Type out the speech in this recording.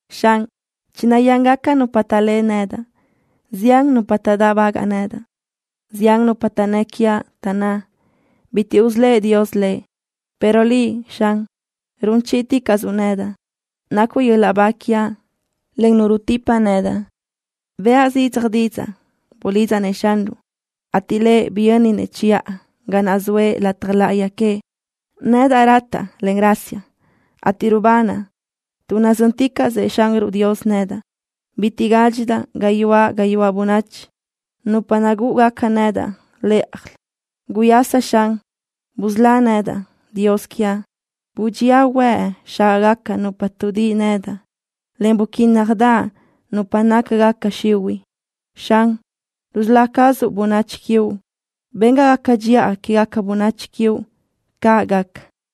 Xan, chinayángacadaʼ nupa taʼlé nedaʼ. Zián nupa taʼdáʼbagaʼ nedaʼ. Zián nupa taʼnnë́ quiaʼ, taʼnná: “Bitiʼ usölë́ʼ Dios lëʼ.” Pero Liʼ, Xan, run chíʼiticaʼsuʼ nedaʼ. Nacuʼ yöl-laʼ ba quiaʼ, en Nu rutipa nedaʼ. Bëʼa zidzaj didzaʼ, bulidzaʼ-nëʼ Xanruʼ, ateʼ Lëʼ biyönnëʼ chiʼa ga naʼ zoëʼ lataj láʼayi queëʼ. Nedaʼ rataʼ, en rasiaʼ, ateʼ rubanaʼ, tuʼ nazö́nticaʼsëʼ Xanruʼ Dios nedaʼ. Bitiʼ gádxidaʼ gayuáʼ gayuáʼ bönachi, nupa naʼ nagúʼugaca nedaʼ lë́ʼajlö. ¡Guyasa, Xan! ¡Busölá nedaʼ, Dios quiaʼ! Budxía huëʼ xágaʼgaca nupa tuʼdíʼi nedaʼ, en buquínnajdaʼ nupa nácagaca xihuiʼ. Xan, rusölá cazuʼ bönachi quiuʼ. Ben ga gaca dxiʼa quégaca bönachi quiuʼ. ¡Caʼ gaca!